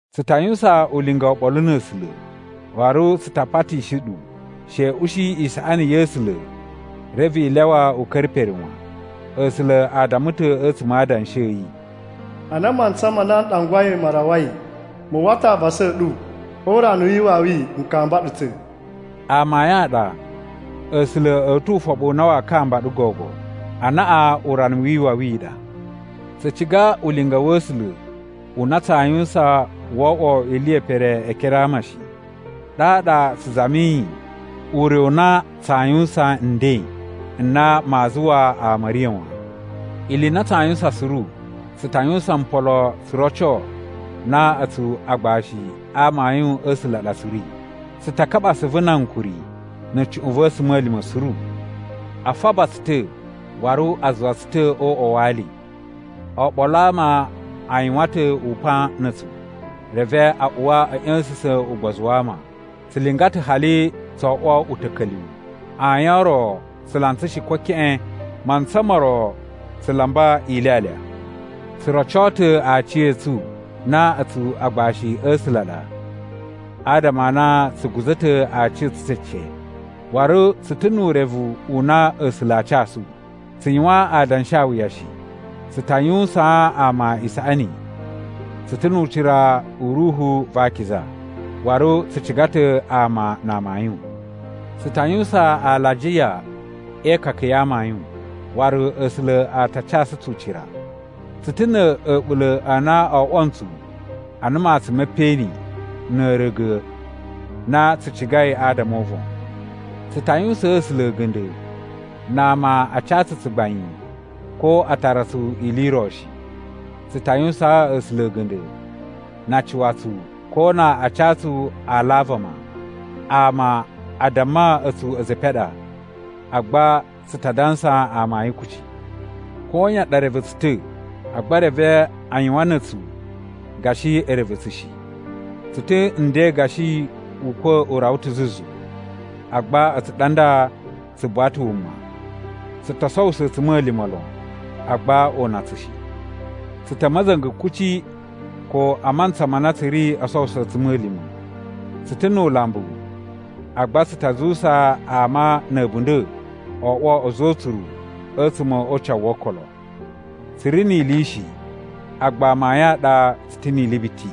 Tsu ta yuwusan ulinga oɓolo na̱ A̱sula̱, waru tsu ta patishi ɗu she i ushi isaꞌani ya̱ A̱sula̱ reve i lyawa u ka̱ra̱ pere wan. A̱sula̱ a damma ta̱ a̱tsuma̱ a Adanshi a̱ yi, “Ana mantsa ma na n ɗangwai ma rawai, mu uwwa ta̱ avasa a̱ ɗu. O urana wi iwawi n kamba ɗu ta̱.” Amayun a ɗa A̱sula̱ a̱ tu ufoɓu na waa kamba ɗu gogo. Anaꞌan urana wi iwawi i ɗa. Tsu ciga ulinga wa̱ A̱sula̱ u na tsaa yuwusan wo oꞌwo ili ye pere e ekere a ama shi, ɗaɗa tsu zamiyi ure u na tsaa yuwusan nden n na maa zuwa ama a̱ riya̱ wan. Ili i na tsaa yuwusan suru, tsu ta yuwusan mpolo tsu roco na a̱tsu agbashi a amayun a̱ A̱sula̱ a ɗa tsu ri. Tsu ta kaɓa asuvu na ankuri na̱ cuꞌun va̱ a̱tsuma̱lima̱ suru. A faba tsu ta̱. Waru a zuwa tsu ta̱ o uꞌwa wa ali. Oɓolo a ama a yuwan ta̱ upan na̱ a̱tsu reve a uwa a̱ ꞌya̱sa̱sa̱n ugbozu wa ama. Tsu linga ta̱ hali tso oꞌwo uta̱ka̱lyuwu. Ayin o ro tsu lantsa shi, ko keꞌen. Mantsa mo ro tsu lamba ilyalya. Tsu roco ta̱ aciya̱tsu na a̱tsu agbashi a̱ A̱sula̱ a ɗa adama a na tsu guza̱ ta̱ aciya̱tsu cece, waru tsu ta̱ nu urevu u na A̱sula̱ aa casu. Tsu yuwan adanshawuya shi. Tsu ta yuwusaan ama isaꞌani. Tsu ta̱ nu ucira u Ruhu va Akiza, waru tsu ciga ta̱ ama na amayun. Tsu ta yuwusan alajiya e ikaka ya amayun, waru A̱sula̱ a ta casu tsu ucira. Tsu ta̱ na̱ a̱ɓula̱ a na o oꞌwo ntsu ana matsun me peꞌeni na̱ a̱a̱ra̱ga̱ na tsu cigai adama o uvon. Tsu ta yuwusaan A̱sula̱ a̱ga̱nda̱ na ama a ca tsu tsugbain, ko a tara tsu ili i ro shi. Tsu ta yuwusaan A̱sula̱ a̱ga̱nda̱ na a cuwa tsu, ko na a ca tsu ala a vama. Ama a damma a̱tsu a̱za̱ e epen a ɗa, agba tsu ta dansa amayun kuci. Koyan ɗa reve tsu ta̱, agba reve a yuwan na̱ a̱tsu gashi e reve tsu shi. Tsu ta̱ nden gashi ukwa̱ u rawa ta̱ zuzu, agba a̱tsu ɗa nda, tsu buwa ta̱ wuma. Tsu to sowuso a̱tsuma̱lima̱ lon, agba o una tsu shi. Tsu ta̱ a̱ ma̱za̱nga̱ kuci, ko a mantsa ma na tsu ri oo sowuso a̱tsuma̱lima̱. Tsu ta̱ nu ulambu, agba tsu ta zuwusa ama na̱ a̱bunda̱ o oꞌwo a̱za̱ o utsuru a̱tsuma̱ o ucawu wo okolo. Tsu ri ni ili shi, agba amayun a ɗa tsu ta̱ ni ili biti.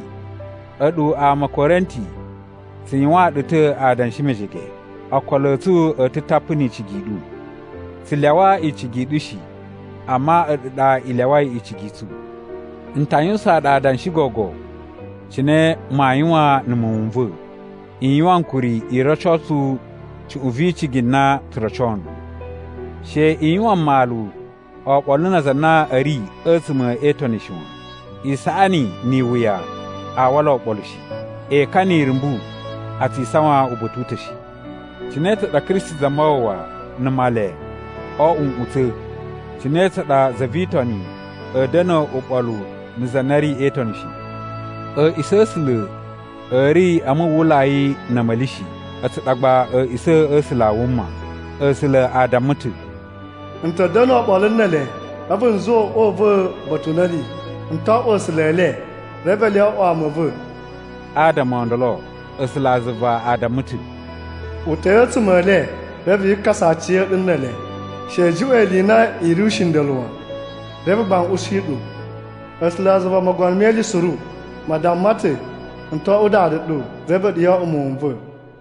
A̱ɗu ama a̱ Korinti, tsu yuwaan ɗu ta̱ adanshi mejege, okolo a̱ tsu a̱ ta̱ tapu ni icigi i ɗu. Tsu lyawa icigi i ɗu shi, amma a̱ɗu ɗa i lyawai icigi i tsu. N ta yuwusaan ɗu adanshi gogo cine maa yuwan na̱ muwun n va̱. I yuwan ankuri i roco tsu cuꞌun vi icigi na tsu roco nɗu. She i yuwan mmalu oɓolo na aza a na a̱ ri a̱tsuma̱ e Itoni shi wan. Isaꞌani ni iwuya a wala oɓolo shi. Ekan ni irumbu a tsi isawan uba̱ta̱ u ta̱ shi. Cine tsa ɗa Kristi Zamawawa na̱ Male oo oꞌwo nꞌutsa̱? Cine tsa ɗa za vi Itoni a̱ da̱na̱ uɓolu na̱ za na ri e Itoni shi? A̱a̱ꞌisa̱ a̱ A̱sula̱ a̱ ri a muwwulai na̱ a̱ma̱li shi. A̱tsu ɗa gba a̱a̱ꞌisa̱ a̱ A̱sula̱ a wuma. A̱sula̱ a damma ta̱ “N ta̱ da̱nu oɓolo ne ele a̱vu n zuwa uꞌwa u va̱ uba̱ta̱ u na a̱ ri. N to oꞌwo A̱sula̱ e le, reve ele o oꞌwo ama a̱ va̱.” Adama o ndolo, A̱sulazuva a damma ta̱, “Uta̱i a̱tsuma̱ e le reve yi kasa aciya̱ɗu ne ele. She i juꞌwa̱n ili i na i ri ushinda̱lu wan, reve gba n ushi ɗu.” A̱sulazuva Mogono me Ili Suru ma damma ta̱, “N to oꞌwo Dada ɗu, reve a̱ɗu yo oꞌwo muwun n va̱.”